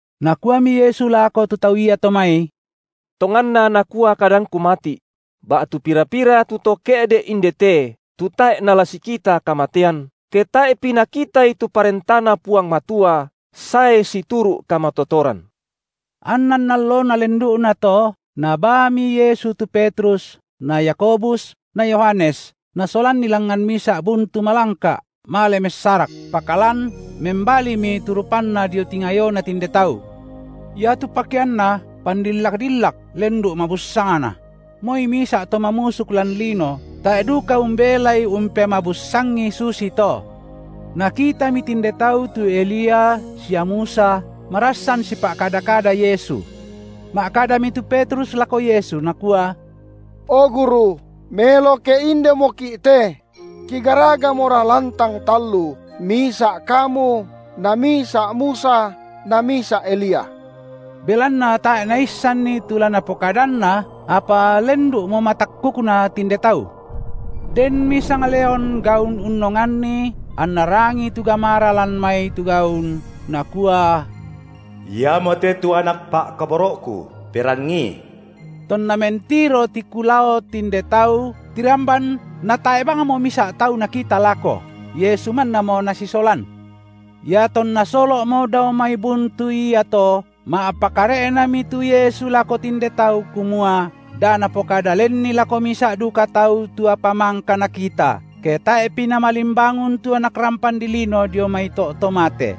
Nakuami Yesu lako tu tau iato mai: Tonganna nakua kadangKu mati’: ba’tu pira-pira tu to ke’de’ inde te tu tae’ nala sikita kamatean, ke tae’pi nakitai tu ParentaNa Puang Matua sae situru’ kamatotoran. Annan allona lendu’nato Nabaami Yesu tu Petrus na Yakobus na Yohanes, Nasolanni langngan misa’ buntu malangka’ male messarak. Pakalan membalimi tu rupanNa dio tingayona tinde tau. Iatu pakeanNa pandillak-dillak lendu’ mabussangna; moi misa’ to mamusuk lan lino tae’ duka umbelai umpemabussangi susito. Nakitami tinde tau tu Elia sia Musa marassan sipa’kada-kada Yesu. Ma’kadami tu Petrus lako Yesu nakua: O Guru, melo ke indemoki’ te; kigaragamora lantang tallu, misa’ Kamu, na misa’ Musa na misa’ Elia. Belanna tae’ naissanni tu la napokadanna, apa lendu’mo matakkukna tinde tau. Denmi sangleon gaun unnonganni anna rangii tu gamara lan mai tu gaun, nakua: Iamote tu Anak Pa’kaboro’Ku, perangiI. Tonna mentiro tiku lao tinde tau tiramban natae’ bangmo misa’ tau nakita lako, Yesu mannamo Nasisolan. Iatonna solo’mo dao mai buntu iato ma’pakare’nami tu Yesu lako tinde tau kumua, da napokada lenni lako misa’ duka tau tu apa mangka nakita, ke tae’pi Namalimbangun tu Anak rampan dilino dio mai to’ to mate.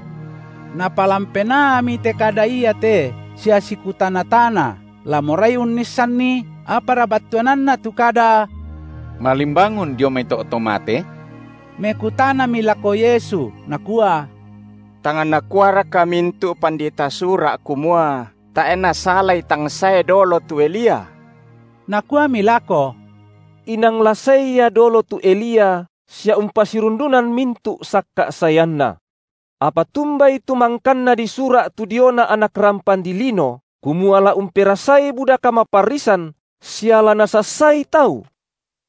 Napalan penaami te kada iate sia sikutana-tana la morai unnissanni, apara battuananna tu kada: malimbangun dio mai to’ to mate? Mekutanami lako Yesu, nakua: Tang nakuaraka mintu’ pandita Sura’ kumua, tae’ nasalai tang sae dolo tu Elia? Nakuami lako: Inang la sae ia dolo tu Elia sia umpasirundunan mintu’ sakka’ saeanna. Apa tumbai tu mangkanna disura’ tu diona Anak rampan dilino, kumua la umperasai buda kamaparrisan sia la nasassai tau?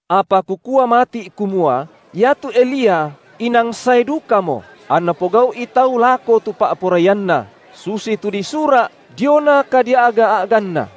Apa Kukua mati’ kumua iatu Elia inang sae dukamo, anna pogau’i tau lako tu pa’poraianna, susitu disura’ diona kadia’ga-a’ganna.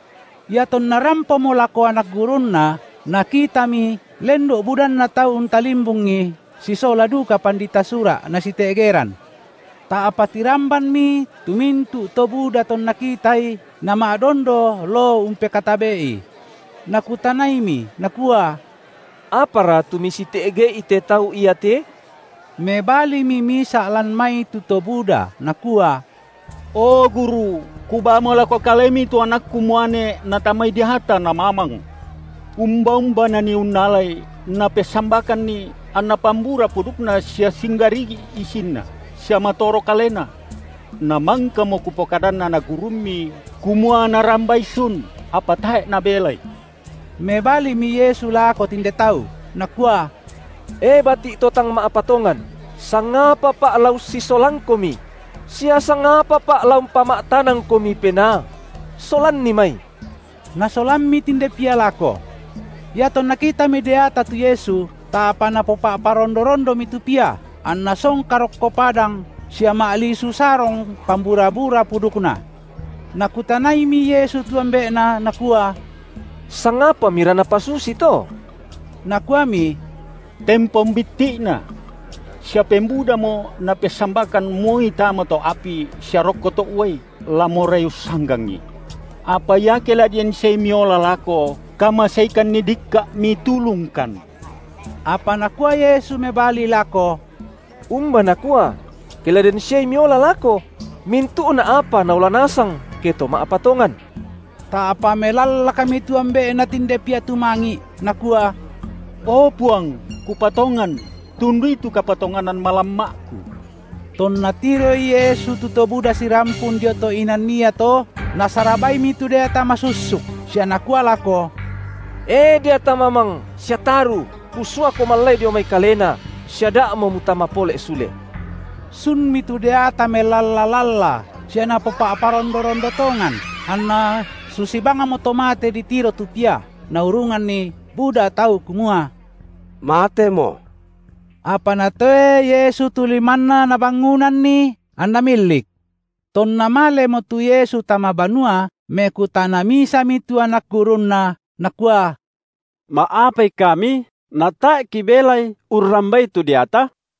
Iatonna rampomo lako anak gurunNa Nakitami lendu’ budanna tau untalimbungi sisola duka pandita Sura’ nasite’geran. Ta’pa tirambanmi tu mintu’ to buda tonna kitai, nama’dondo loo umpekatabe’I. Nakutanaimi Nakua: Apara tu misite’ge’i te tau iate? Mebalimi misa’ lan mai tu to buda nakua: O Guru, kubaamo lako Kalemi tu anakku muane natamai deata namamang. Umba-umba nanii unnalai, napessambakanni, anna pambura pudukna sia singgarigi’ isinna, sia matoro kalena. Namangkamo kupokadan anak gurumMi, kumua narambai sun, apa tae’ nabelai. Mebalimi Yesu lako tinde tau, Nakua: E bati’ to tang ma’patongan! sangapaPa’ la ussisolangkomi? sia sangapaPa’ la umpama’tanangkomi penaa? Solanni mai! Nasolammi tinde pia lako. Iatonna kitami deata tu Yesu, ta’pa napopa’parondo-rondomi tu pia, anna songka rokko padang sia ma’lisu sarong pambura-bura pudukna. Nakutanaimi Yesu tu ambe’na Nakua: Sangapamira napasusi to? Nakuami: Tempon bitti’na. Sia pembudamo napessambakan moi tama to’ api sia rokko to’ uai, la morai ussanggangi. Apa iake la den siai Miola lako, kamaseikanni dikka’ Mitulungkan. Apa Nakua Yesu mebali lako: Umba nakua: Ke la den siai Miola lako? Mintu’na apa naola nasang, ke to ma’patongan. Ta’pa melallakmi tu ambe’na tinde pia tumangi’, nakua: O Puang, kupatongan, tundui tu kapatonganan malamma’ku! Tonna tiroi Yesu tu to buda sirampun dio to’ inan iato, Nasarabaimi tu deata masussuk sia Nakua lako: E deata mamang sia taru, Kusuako mallai dio mai kalena, sia da’mo mutama pole’ sule. Sunmi tu deata melalla-lalla sia napopa’parondo-rondo tongan, anna susi bangmo to mate ditiro tu pia, naurunganni buda tau kumua: matemo. Apa Natoe Yesu tu limanna Nabangunanni, anna millik. Tonna malemo tu Yesu tama banua, mekutana misami tu anak gurunNa, nakua: Ma’apai kami natae’ kibelai urrambai tu deata?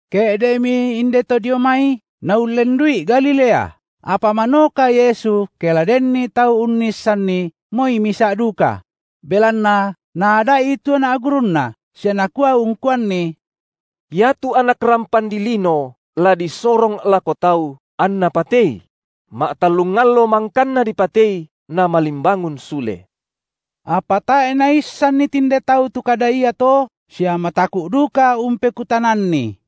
Ke’de’mi inde to dio mai naullendu’i Galilea, apa manoka Yesu ke la denni tau unnissanni, moi misa’ duka; belanna Naada’i tu anak gurunNa, sia Nakua ungkuanni: Iatu Anak rampan dilino la disorong lako tau, anna patei; ma’tallung allo mangkanna dipatei Namalimbangun sule. Apa tae’ naissanni tinde tau tu kada iato, sia mataku’ duka umpeku- tananNi.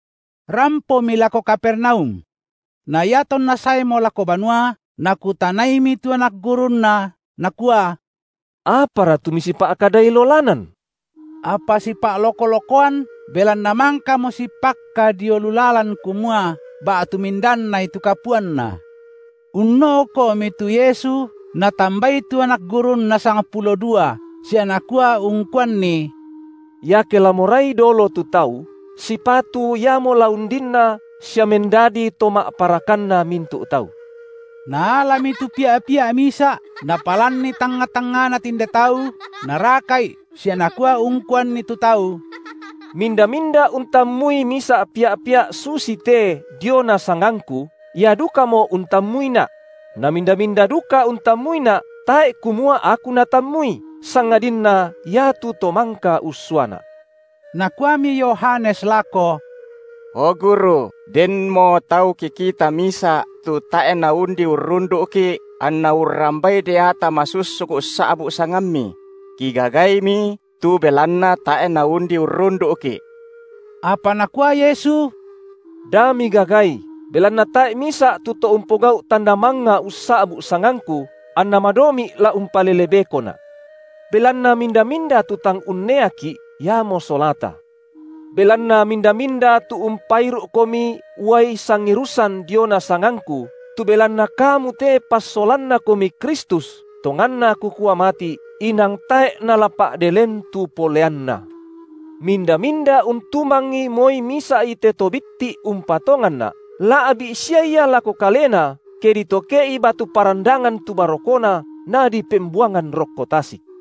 Rampomi lako Kapernaum. Na iatonna saemo lako banua, Nakutanaimi tu anak gurunNa, Nakua: Apara tu misipa’kadai lolanan? Apa sipa’loko-lokoan belanna mangkamo sipakka dio lu lalan kumua, ba’tu mindannai tu kapuanna. Unno’ko’mi tu Yesu, Natambai tu anak gurunNa sangpulo dua sia Nakua ungkuanni: Iake la morai dolo tu tau, sipatu iamo la undinna sia mendadi to ma’parakanna mintu’ tau. Naalami tu pia’-pia’ misa’, Napalanni tangnga-tangngana tinde tau, Naraka’i sia Nakua ungkuanni tu tau: Minda-minda untammui misa’ pia’-pia’ susite diona sangangKu, ia dukamo untammuiNa’; na minda-minda duka untammuiNa’, tae’ kumua Aku natammui, sangadinna iatu To mangka ussuaNa’. Nakuami Yohanes lako: O, Guru, denmo tau kikita misa’, tu tae’ naundi urrundu’ki’, anna urrambai deata masussuk ussa’bu’ sangamMi; kigagaimi, tu belanna tae’ naundi urrundu’ki’. Apa Nakua Yesu: Da migagai, belanna tae’ misa’ tu to umpogau’ tanda mangnga ussa’bu sangangKu, anna madomi’ la umpalele bekoNa’. Belanna minda-minda tu tang unneaki’, iamo solata. Belanna minda-minda tu umpairu’komi uai sangirusan diona sangangKu, tu belanna kamu te passolannakomi Kristus, tonganna Kukua mati’, inang tae’ nala pa’de len tu poleanna. Minda-minda untumangi moi misa’i te to bitti’ umpatonganNa’, la’bi’ sia ia lako kalena, ke ditoke’i batu parandangan tu barokona, nadipembuangan rokko tasik.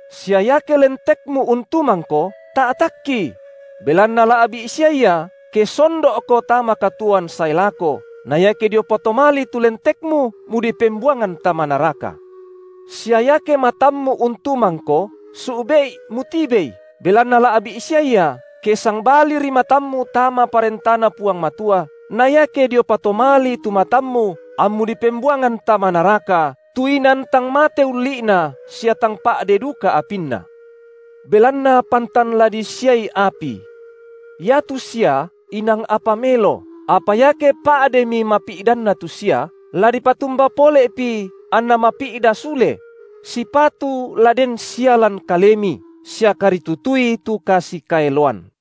Sia iake lentekmu untumangko, ta’takki; belanna la’bi’ sia ia, ke sondo’ko tama katuoan sae lako, na iake dio patomalii tu lentekmu mudipembuangan tama naraka. Sia iake matammu untumangko, su’be’i mutibei, belanna la’bi’ sia ia, ke sangbaliri matammu tama ParentaNa Puang Matua, na iake dio patomalii tu matammu ammu dipembuangan tama naraka, tu inan tang mate ulli’na sia tang pa’de duka apinna. Belanna pantan la disiai api. Iatu sia inang apa melo, apa iake pa’denmi mapi’danna tu sia, la dipatumba pole’pi anna mapi’da sule? Sipatu la den sia lan kalemi, sia karitutui tu kasikaeloan.